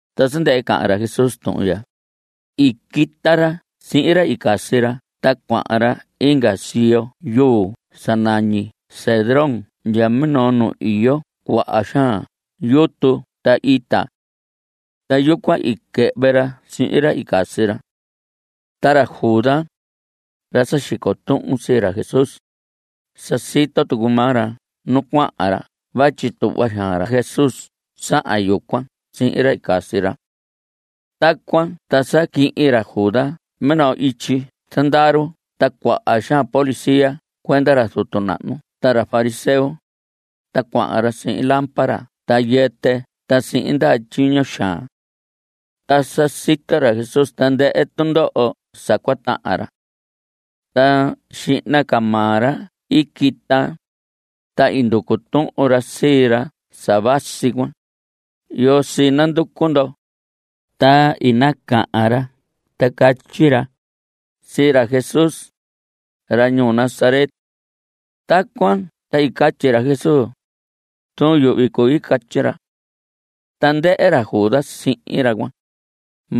Ta sa ndɨhɨ cahan ra Jesús tuhun ya, i quita ra sihin ra i casi ra ta cuahan ra inga siyo yuu sa nañi Cedrón ndya minoo nu iyo cuaha xaan yutu ta ita. Ta yucuan i quɨhvɨ ra sihin ra i casi ra. Ta ra Judas, ra sa xico tuhun sii ra Jesús, sa sito tucu maa ra nu cuahan ra vatyi tuhva xaan ra Jesús sahan yucuan sihin ra i casi ra. Tacuan ta sa quihin ra Judas minoo ityi zandaru ta cuaha xaan policía cuenda ra zutu nahnu ta ra fariseo, ta cuahan ra sihin lámpara ta yɨtɨ ta sihin ndaha tyiño xaan. Ta sa sito ra Jesús tandɨhɨ tundoho sa cua tahan ra. Ta xihna ca maa ra i quita, ta i nducu tuhun ra sii ra sa vasi cuan: ¿Yoo sii nanducu ndo? Ta i nacahan ra ta catyi ra: Sii ra Jesús, ra ñuu Nazaret. Tacuan ta i catyi ra Jesús: Zuun yuhvi cui. Catyi ra. Ta ndɨhɨ ra Judas sihin ra cuan.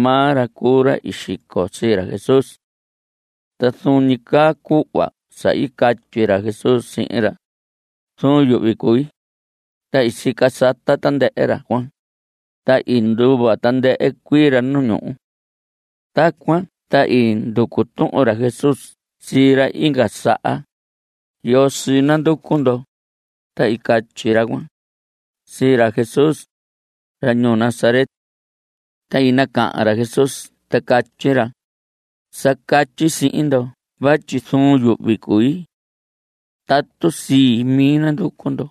Maa ra cuu ra i xico sii ra Jesús. Ta zuun ñi caa cuhva sa i catyi ra Jesús sihin ra: “Zuun yuhvi cui”, ta i sica sata tandɨhɨ ra cuan, ta i nduva tandɨhɨ cuii ra nu ñuhu. Tacuan ta i nducu tuhun ra Jesús sii ra inga saha: ¿Yoo sii nanducu ndo? Ta i catyi ra cuan: Sii ra Jesús, ra ñuu Nazaret. Ta i nacahan ra Jesús ta catyi ra: Sa catyi sihin ndo vatyi zuun yuhvi cui. Tatu sii mi nanducu ndo,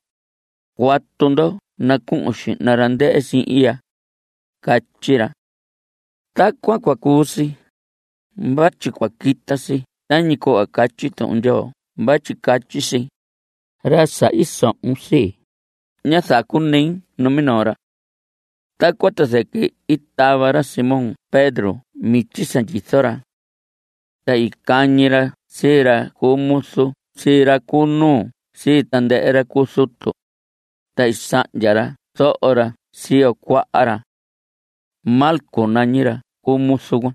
cuatu ndo nacuhun xihna ra ndɨhɨ sihin ya. Catyi ra. Tacuan cua cuu si, vatyi cua quita si tañi cuhva catyi Tuhun Ndyoo vatyi catyi si: “Ra sa i sohon sii, ñá zacunei numinoo ra.” Tacuan ta zɨquɨ i tava ra Simón Pedro mityi sa ndyizo ra. Ta i cañi ra sii ra cu muzu sii ra cu nuu sii tandɨhɨ ra cu zutu, ta i sahndya ra zoho ra siyo cuaha ra. Malco nañi ra cu muzu cuan.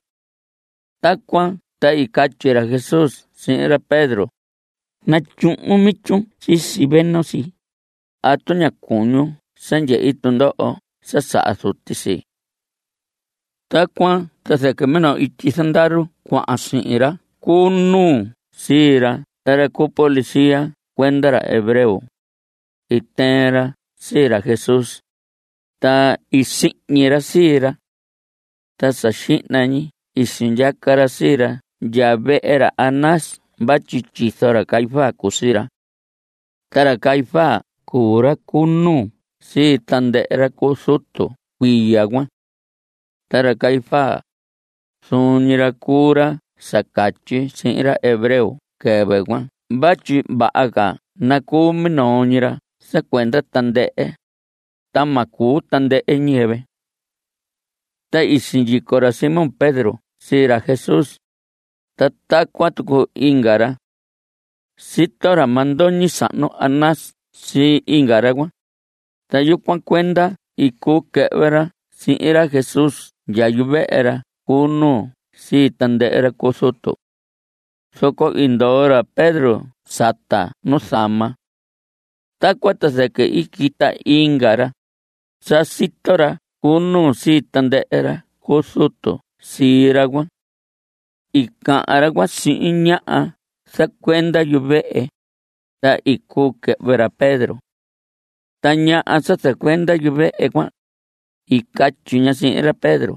Tacuan ta i catyi ra Jesús sihin ra Pedro: Natyuhun mityun sisi veno si. ¿Atu ña cuñun sa ndyehi tundoho sa saha Zuti sii? Tacuan ta zɨquɨ minoo ityi zandaru cuan, sihin ra cu nuu sii ra ta ra cu policía cuenda ra hebreo, i tɨɨn ra sii ra Jesús, ta i sihñi ra sii ra. Ta sa xihna ñi i sindyaca ra sii ra ndya vehe ra Anás vatyi tyizo ra Caifás cuu sii ra. Ta ra Caifás cuu ra cu nuu sii tandɨhɨ ra cu zutu cuiya cuan. Ta ra Caifás, zuun ñi ra cuu ra sa catyi sihin ra hebreo quɨvɨ cuan vatyi vaha ca nacuu minoo ñi ra sa cuenda tandɨhɨ, ta ma cuu tandɨhɨ ñiyɨvɨ. Ta i sindyico ra Simón Pedro sii ra Jesús, ta tacuan tucu inga ra. Sito ra mandoñi sahnu Anás sii inga ra cuan, ta yucuan cuenda i cuu quɨhvɨ ra sihin ra Jesús ndya yuvehe ra cu nuu sii tandɨhɨ ra cu zutu. Zoco i ndoo ra Pedro sata nuzama. Tacuan ta zɨquɨ i quita inga ra. Sa sito ra cu nuu sii tandɨhɨ ra cu zutu sii ra cuan. I cahan ra cuan sihin ñaha zacuenda yuvehe, ta i cuu quɨhvɨ ra Pedro. Ta ñaha sa zacuenda yuvehe cuan, i catyi ña sihin ra Pedro: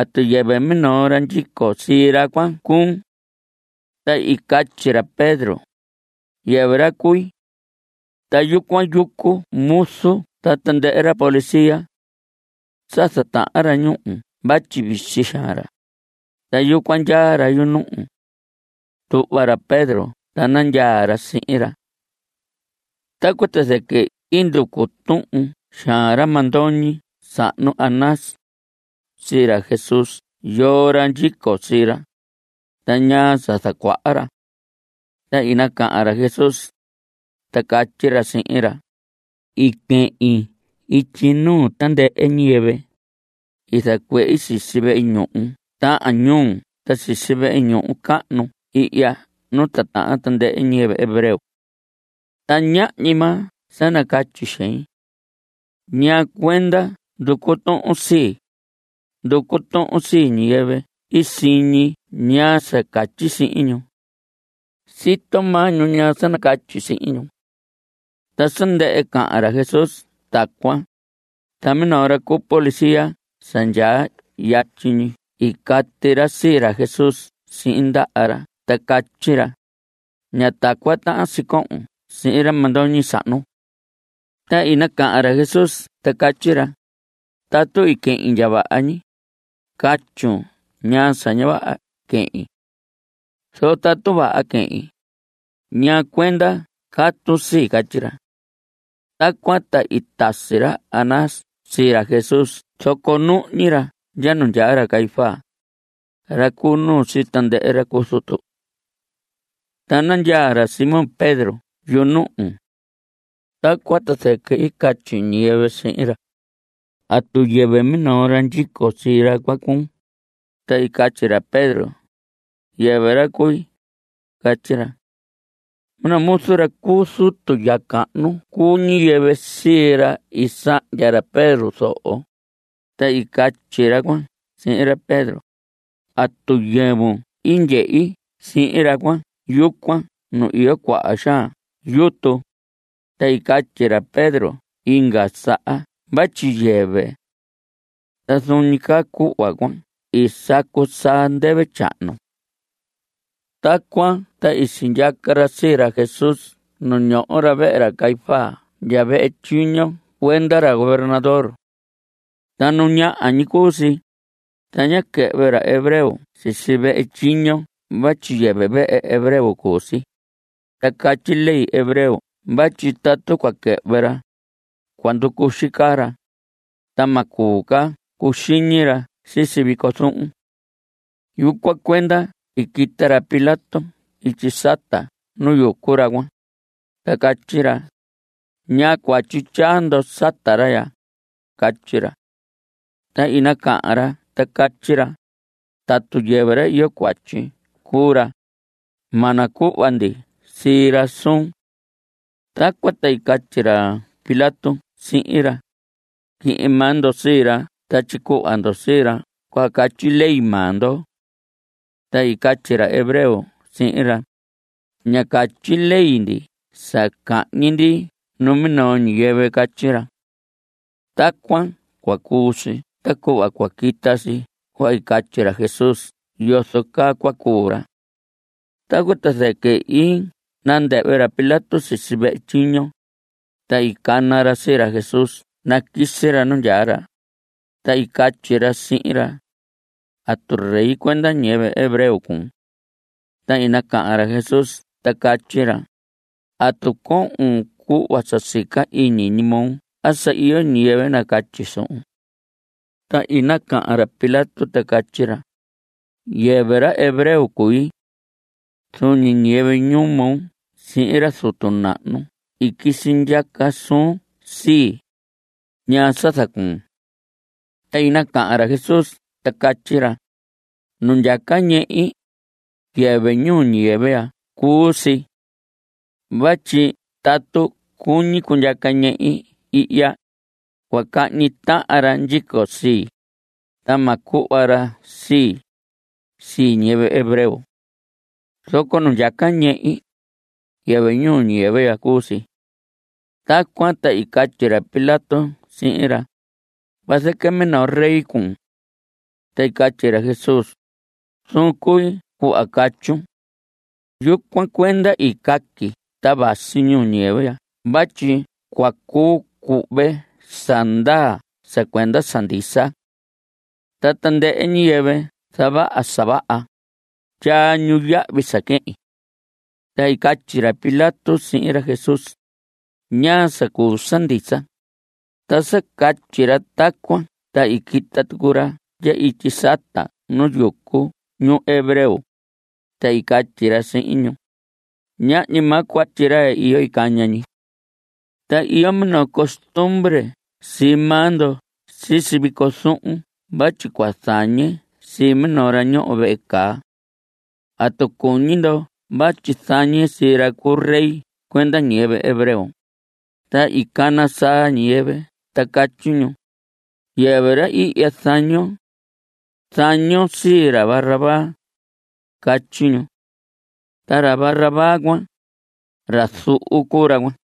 ¿Atu yɨvɨ minoo ra ndyico sii ra cuan cuun? Ta i catyi ra Pedro: Yɨvɨ ra cui. Ta yucuan yucu muzu ta tandɨhɨ ra policía. Sa zatahan ra ñúhu vatyi visi xaan, ta yucuan ndyaa ra yunuhu. Tuhva ra Pedro ta nandyaa ra sihin ra. Tacuan ta zɨquɨ i nducu tuhun xaan ra mandoñi sahnu, ra Anás, sii ra Jesús yoo ra ndyico sii ra, ta ñaa sa zacuaha ra. Ta i nacahan ra Jesús, ta catyi ra sihin ra: I quehin ityi nuu tandɨhɨ ñiyɨvɨ. I zacuehi sisi vehe ñuhu tahan ñuu ta sisi vehe ñuhu cahnu ihya nu titahan tandɨhɨ ñiyɨvɨ hebreo. Ta ñahñi maa sa nacatyi xehi. ¿Ñaa cuenda nducu tuhun sii? Nducu tuhun sii ñiyɨvɨ i siñi ñaa sa nacatyi sihin ñu. Sito maa ñu ñaa sa nacatyi sihin ñu. Ta sa ndɨhɨ cahan ra Jesús tacuan, ta minoo ra cu policía sa ndyaa yatyi ñi i cati ra sii ra Jesús sihin ndaha ra ta catyi ra: Ña tacuan tahan si cohon sihin ra mandoñi sahnu. Ta i nacahan ra Jesús ta catyi ra: Tatu i quehin ndya vaha ñi, catyun ñaa sa ña vaha quehin. Zoco tatu vaha quehin ¿ñaa cuenda catun sii? Catyi ra. Tacuan ta i tasi ra Anás sii ra Jesús zoco nuhñi ra ndya nu ndyaa ra Caifás, ra cu nuu sii tandɨhɨ ra cu zutu. Ta nandyaa ra Simón Pedro yunuhu. Tacuan ta zɨquɨ i catyi ñiyɨvɨ sihin ra: ¿Atu yɨvɨ minoo ra ndyico sii ra cuan cuun? Ta i catyi ra Pedro: Yɨvɨ ra cui. Catyi ra. Minoo muzu ra cu zutu ya cahnu cuu ñiyɨvɨ sii ra i sahndya ra Pedro zoho, ta i catyi ra cuan sihin ra Pedro: ¿Atu yɨvun i ndyehi sihin ra cuan yucuan nu iyo cuaha xaan yutu? Ta i catyi ra Pedro inga saha vatyi yɨvɨ. Ta zuun ñi caa cuhva cuan i sacu saa ndɨvɨ tyahnu. Tacuan ta i sindyaca ra sii ra Jesús nu ñoho ra vehe ra Caifás ndya vehe tyiño cuenda ra gobernador. Ta nu ñaha ñi cuu si. Ta ñá quɨhvɨ ra hebreo sisi vehe tyiño vatyi yɨvɨ vehe hebreo cuu si, ta catyi ley hebreo vatyi tatu cua quɨhvɨ ra, cua nducuxi caa ra, ta ma cuu ca cuxiñi ra sisi vico zuhun. Yucuan cuenda i quita ra Pilato ityi sata nu yucu ra cuan, ta catyi ra: ¿Ñaa cuatyi tyaa ndo sata ra ya? Catyi ra. Ta i nacahan ra ta catyi ra: Tatu yɨvɨ ra iyo cuatyi cuu ra, ma nacuhva ndi sii ra suun. Tacuan ta i catyi ra Pilato sihin ra: Quihin maa ndo sii ra ta tyicuhva ndo sii ra cuhva catyi ley maa ndo. Ta i catyi ra hebreo sihin ra: Ña catyi ley ndi sa cahñi ndi numinoo ñiyɨvɨ. Catyi ra. Tacuan cua cuu si ta cuhva cua quita si cuhva catyi ra Jesús yozo caa cua cuu ra. Tacuan ta zɨquɨ i nandɨhvɨ ra Pilato sisi vehe tyiño, ta i cana ra sii ra Jesús naquisi ra nu ndyaa ra, ta i catyi ra sihin ra: ¿Atu rey cuenda ñiyɨvɨ hebreo cuun? Ta i nacahan ra Jesús ta catyi ra: ¿Atu cohon cuhva sa sica ñi iñi moo a sa iyo ñiyɨvɨ nacatyi suhun? Ta i nacahan ra Pilato ta catyi ra: Yɨvɨ ra hebreo cui. Zuun ñi ñiyɨvɨ ñuu moo sihin ra zutu nahnu i quisi ndyaca suun sii. ¿Ñaa sa zacuun? Ta i nacahan ra Jesús ta catyi ra: Nu ndyaca ñehi, yɨvɨ ñuu ñiyɨvɨ ya cuu si. Vatyi tatu cuñi cundyaca ñehi ihya, cua cahñi tahan ra ndyico sii, ta ma cuhva ra sii, sii ñiyɨvɨ hebreo. Zoco nu ndyaca ñehi, yɨvɨ ñuu ñiyɨvɨ ya cuu si. Tacuan ta i catyi ra Pilato sihin ra: Vazɨquɨ minoo rey cuun. Ta i catyi ra Jesús: Zuun cui cuhva catyun. Yucuan cuenda i caqui ta vasi ñuu ñiyɨvɨ ya vatyi cua cuu cuhve sa ndaa sa cuenda sa ndisa. Ta tandɨhɨ ñiyɨvɨ zavaha sa vaha, tyaa ñu yahvi sa quehin. Ta i catyi ra Pilato sihin ra Jesús: ¿Ñaa sa cuu sa ndisa? Ta sa catyi ra tacuan ta i quita tucu ra ndya ityi sata nu yucu ñu hebreo, ta i catyi ra sihin ñu: Ñahñi maa cuatyi ra iyo caña ñi. Ta iyo minoo costumbre sii maa ndo sisi vico zuhun vatyi cua zañe sii minoo ra ñoho vehe caa. ¿Atu cuñi ndo vatyi zañe sii ra cu rey cuenda ñiyɨvɨ hebreo? Ta i cana saa ñiyɨvɨ ta catyi ñu: Yɨvɨ ra ihya zañon. Zañon sii ra Barrabás. Catyi ñu. Ta ra Barrabás cuan, ra zuhu cuu ra cuan.